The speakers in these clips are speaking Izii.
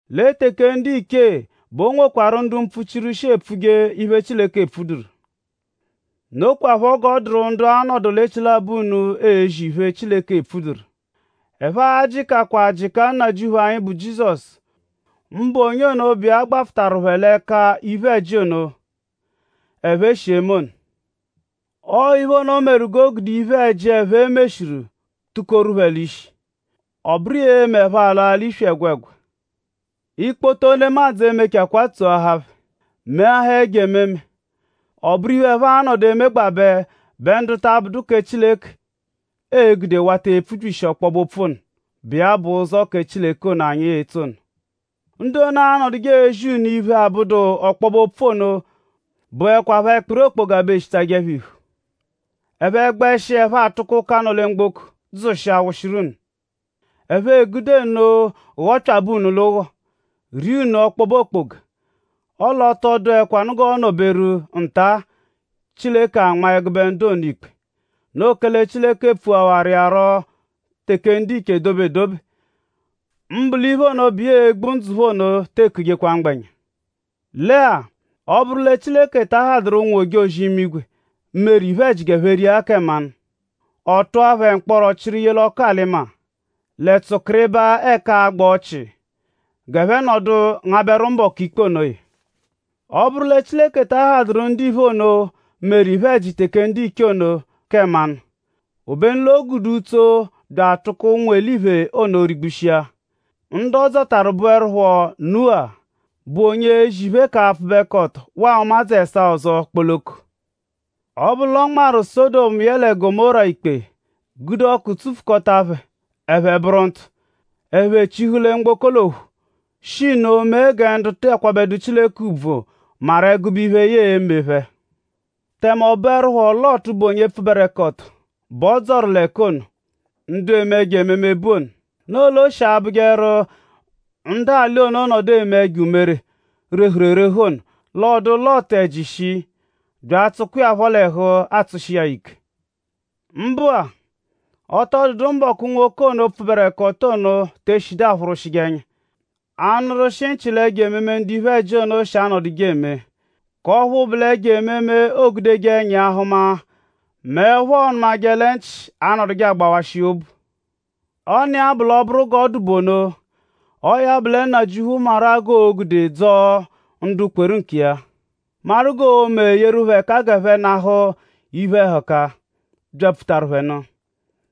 Lẹ teke ndiche bẹ o nwekwarụ ndu mpfuchiru shi epfuje iphe, Chileke epfuduru. Nokwaphọ g'ọ dụru ndu a-nọdu l'echilabọ unu ezi iphe, Chileke epfuduru. Ẹphe a-jịkachakwa jịka Nnajịuphu anyi, bụ Jizọsu; mbụ onye ono, bụ iya gbafụtaru phẹ l'ẹka iphe-ẹji ono, ẹphe shi eme ono. Ọo iphe ono meru g'o gude iphe-ẹji, ẹphe meshiru tukoru phẹ l'ishi. Ọ bụru iya e-me ẹphe alaa l'iyi ẹgwegwa. Ikpoto nemadzụ e-mechakwaa tsoahaa phẹ; meahaa ẹjo ememe. Ọoburu iphe, ẹphe a-nọdu emegbabẹ bẹ ndu ta abụdu ndu kẹ Chileke ee-gude wata epfubyishi ọkpobe-opfu ono, bụ iya bụ ụzo kẹ Chileke ono, anyi etso ono. Ndu ono, anọduje ezi unu iphe, abụdu ọkpobe-opfu ono bụekwapho ẹkpiri okpoga bẹ eshitajẹ phẹ iphu. Ẹphe -gbẹshi; ẹphe atụko ụka, nọ lẹ mgboko dzụshia wụshiru unu. Ẹphe egude nno ghọpyabe unu l'ụgho; ria unu ọkpobe okpoga. Ọle ọ tọ dụekwanu g'ọo-nọ-beru nta-a; Chileke anmaa ẹgube ndu ono ikpe. Noo kẹle Chileke pfuhawaru iya rọ teke ndiche dobe edobe. Mbụ l'iphe ono, bụ iya e-gbu ndzụ phẹ ono te ekujekwa mgbẹnya. Lẹ-a; ọ -bụru lẹ Chileke ta ahadụru ụnwu-ojozi-imigwe, meru iphe-ẹji g'ẹphe ria ya kẹ mmanụ; ọ tụa phẹ mkpọro chịru ye l'ọku-alị-maa; lẹ tsụkiribaa ẹka agba ọchii g'ẹphe nọdu ngabẹru mbọku ikpe onoya; ọ -bụru lẹ Chileke ta ahadụru ndiphe ono, meru iphe-ẹji teke ndiche ono kẹ mmanụ; obenu l'o gude utso bya atụko ụnwu-eliphe ono rigbushia; ndu ọ dzọtaru bụerupho Nuwa, bụ onye ezi phẹ k'apfụbekoto waa ụmadzu ẹsaa ọzo kpoloko; ọ -bụru l'ọ nmarụ Sọdomu yẹe Gọmóra ikpe gude ọku tsufukọta phẹ ẹphe bụru ntụ; ẹphe chịhu lẹ mgboko l'ophu; shi nno mee gẹ ndu ta akwabẹdu Chileke ùbvù maru ẹgube iphe, ya e-me phẹ; tẹme ọ bụerupho Lọtu, bụ onye pfụberekoto bẹ ọ dzọru l'ẹka ono, ndu eme ẹjo-ememe bu ono. Nno l'o shi abụjeru; ndu alị ono -nọdu eme ẹjo umere, rehuru erehu ono; l'ọodu Lọtu ẹji shii; bya atsụkwa iya phọ l'ẹhu atsụshi iya ya ike. Mbụ-a; ọ tọ dụdu mbọku-mbọku, nwoke ono pfụberekoto ono te eshidu aphụrwushije ẹnya; anụrwushi nchị l'ẹjo-ememe, ndu iphe-ẹji ono shi anọduje eme; k'ọphu bụ l'ẹjo-ememe, oogudeje ẹnya hụma mẹ ọphu ọonu lẹ nchị shi anọduje agbawashị iya obu. Ọniya bụ l'ọ -bụru l'o noo g'ọ dụ bụ ono; ọo ya bụ lẹ Nnajịuphu maru-a g'oo-me dzọo ndu kweru nkiya; maru g'oo-me yeru phẹ ẹka g'ẹphe nahụ iphe-ẹhuka, byapfutaru phẹ nụ;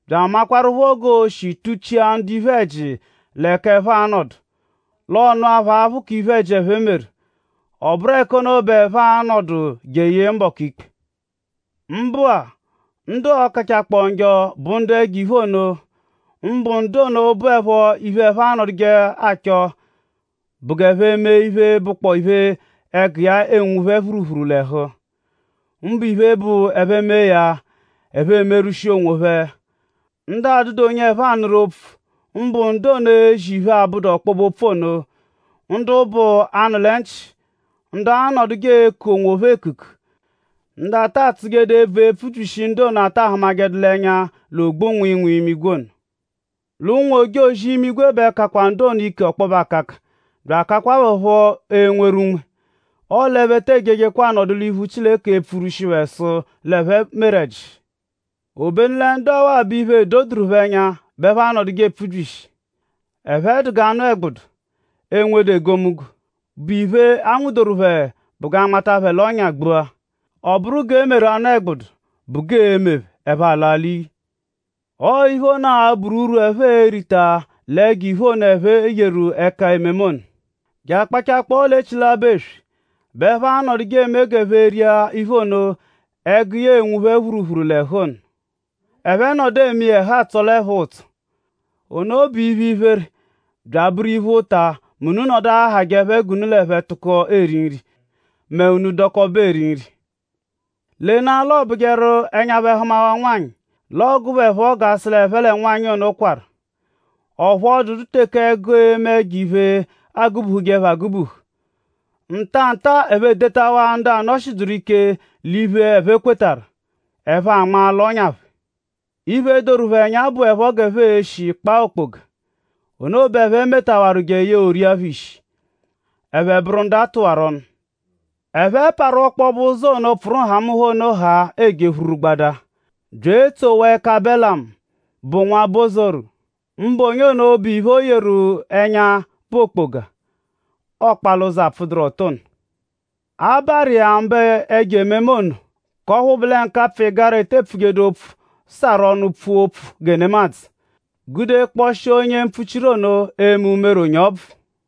bya amakwarụpho g'oo-shi tuchia ndu iphe-ẹji l'ẹka ẹphe a-nọdu; l'ọ nụa phẹ aphụ k'iphe-ẹji, ẹphe meru; ọ bụru ẹka ono bẹ ẹphe a-nọdu jeye mbọku ikpe. Mbụ-a; ndu ọo-kachakpọo njọ bụ ndu ẹjo-iphe ono; mbụ ndu ono, bụepho iphe, ẹphe anọdujeepho achọ bụ g'ẹphe mee iphe, bụkpoo iphe, ẹgu iya enwu phẹ phuruphuru l'ẹhu; mbụ iphe, bụ ẹphe -mee ya; ẹphe emerwushia onwophẹ; ndu adụdu onye ẹphe anụru opfu; mbụ ndu ono, ezi iphe, abụdu ọkpobe-opfu ono; ndu bụ 'anụ-lẹ-nchị; ndu anọduje eku onwophẹ ekuku; ndu ata atsụjedu ebvu epfubyishi ndu ono, a ta ahụmajedu l'ẹnya l'ogbu-nwịinwii imigwe ono. L'ụnwu-ojozi-imigwe bẹ kakwa ndu ono ike ọkpobe akaka bya akakwa phẹ phọ enweru unme; ọle ẹphe te ejejekwa anọdu l'iphu Chileke epfurwushi phẹ sụ l'ẹphe meru ẹji. Obenu lẹ ndu ọwa-a; bụ iphe, edoduru phẹ ẹnya bẹ ẹphe anọduje epfubyishi. Ẹphe dụ g'anụ-ẹgbudu, enwedu egomunggo, bụ iphe, a nwụdoru phẹ bụ g'a nmatajẹ phẹ l'ọ́nyà gbua; ọ bụru g'e meru anụ-ẹgbudu bụ g'ee-me phẹ; ẹphe alaa l'iyi. Ọo iphe ono a-bụru urwu, ẹphe e-rita l'ẹjo-iphe ono, ẹphe yeru ẹka ememe ono. Je akpachakpọo l'echilabọ eswe bẹ ẹphe anọdujeela-a eme g'ẹphe ria iphe ono, ẹgu iya enwu phẹ phuruphuru l'ẹhu ono; ẹphe -nọdu eme iya ẹhu atsọle phẹ-a ụtso. Ono bụ iphe, iphere bya abụru iphe, ụta mẹ unu -nọdu ahajẹ phẹ g'unu l'ẹphe tụko eri nri; mẹ unu dọkobe eri nri. Lenaa l'ọobujeru; ẹnya phẹ -hụmawaa nwanyị; l'ọogue phẹ phọ g'a sụ l'ẹphe lẹ nwanyị ono kwarụ. Ọphu ọ dụdu teke ẹgu eme ẹjo-iphe agụ-buhuje phẹ agụ-buhu. Ntanta-a ẹphe edetawa ndu ọphu anọ-shiduru ike l'iphe, ẹphe kwetarụ; ẹphe anma l'ọ́nyà phẹ. Iphe, doru phẹ ẹnya bụepho g'ẹphe e-shi kpaa okpoga. Ono bẹ ẹphe metawaru jeye o ria phẹ ishi; ẹphe bụru ndu a tụwaru ọnu! Ẹphe parụ ọkpobe ụzo ono, pfụru nhamụnha ono haa eje phururugbadaa; bya eetsowaa ẹka Belamu, bụ nwa Bosoru; mbụ onye ono bụ iphe, o yeru ẹnya bụ okpoga, ọokpa l'ụzo apfụduru ọto ono. A baarụ iya mba ẹjo-ememe ono; k'ọphu bụ lẹ nkapfụ-ịgara, ete pfujedu opfu sarụ ọnu pfua opfu gẹ nemadzụ gude kpọshia onye mpfuchiru ono eme umere onye ọbvu.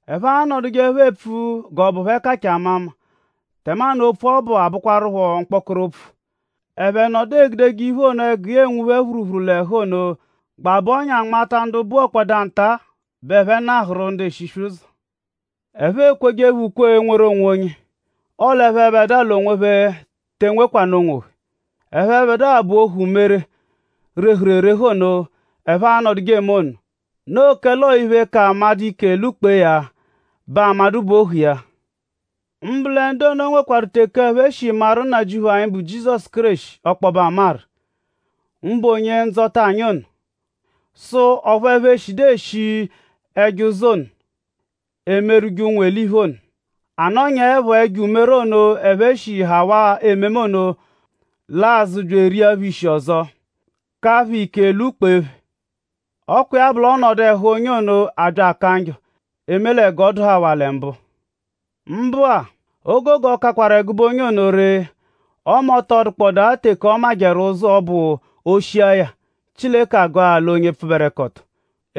Ẹphe anọdujeepho epfu g'ọ bụ phẹ kachaa amama; tẹmanu opfu ọbu abụkwarupho mkpọkoro opfu. Ẹphe nọdu egudeje iphe ono, ẹgu iya enwu phẹ phuruphuru l'ẹhu ono gbabẹ ọ́nyà nmata ndu buwokwadụ-a bẹ ẹphe nahụru ndu eshiswe ụzo. Ẹphe ekweje phẹ ukwe enweru onwonye; ọle ẹphebedua l'onwophẹ te enwekwanụ onwophẹ. Ẹphebedua bụ ohu umere, rehuru erehu ono, ẹphe anọduje eme ono. Noo kẹle ọo iphe, ka amadụ ike; lwụ-kpee ya bẹ amadụ bụ ohu iya. Mbụ lẹ ndu ono nwekwarụ-a teke ẹphe shi maru Nnajịuphu anyi, bụ Jizọsu Kéreshi ọkpobe amaru; mbụ Onye-Ndzọta anyi ono. Sụ ọphu ẹphe eshiẹdu eshi ẹjo ụzo ono, emerwụje ụnwu-eliphe ono. A nọnyaepho; ẹjo umere ono, ẹphe shi hawaa ememe ono lwa azụ bya eria phẹ ishi ọzo; ka phẹ ike lwụ-kpee phẹ. Ọ kwa iya bụ l'ọnodu ẹhu onye ono abya aka njọ; eme lẹ g'ọ dụhawaa lẹ mbụ. Mbụ-a; o gogo kakwaru ẹgube onye ono ree; ọme ọ tọ dụkpodaa teke ọ majẹru ụzo bụ o -shia ya; Chileke agụa ya l'onye pfụberekoto;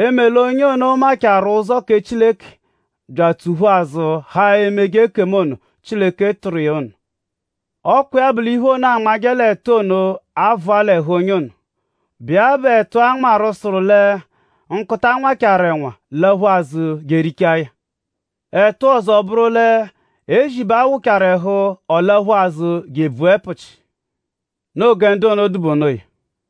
eme l'onye ono machaarụ ụzo kẹ Chileke bya atsụ-phu azụ haa emeje ekemu ono, Chileke tụru iya ono. Ọ kwa iya bụ l'iphe ono, aanmajẹ l'ẹtu ono a-vụa l'ẹhu onye ono, bụ iya bụ ẹtu, a nmarụ, sụru lẹ “Nkụta nwachaaru ẹnwa laphu azụ je erichaa ya.” Ẹtu ọzo bụru lẹ “Ezi bẹ a wụchaaru ẹhu; ọ laphu azụ je ebvua ẹpuchi.” Noo gẹ ndu ono dụ bụ onoya.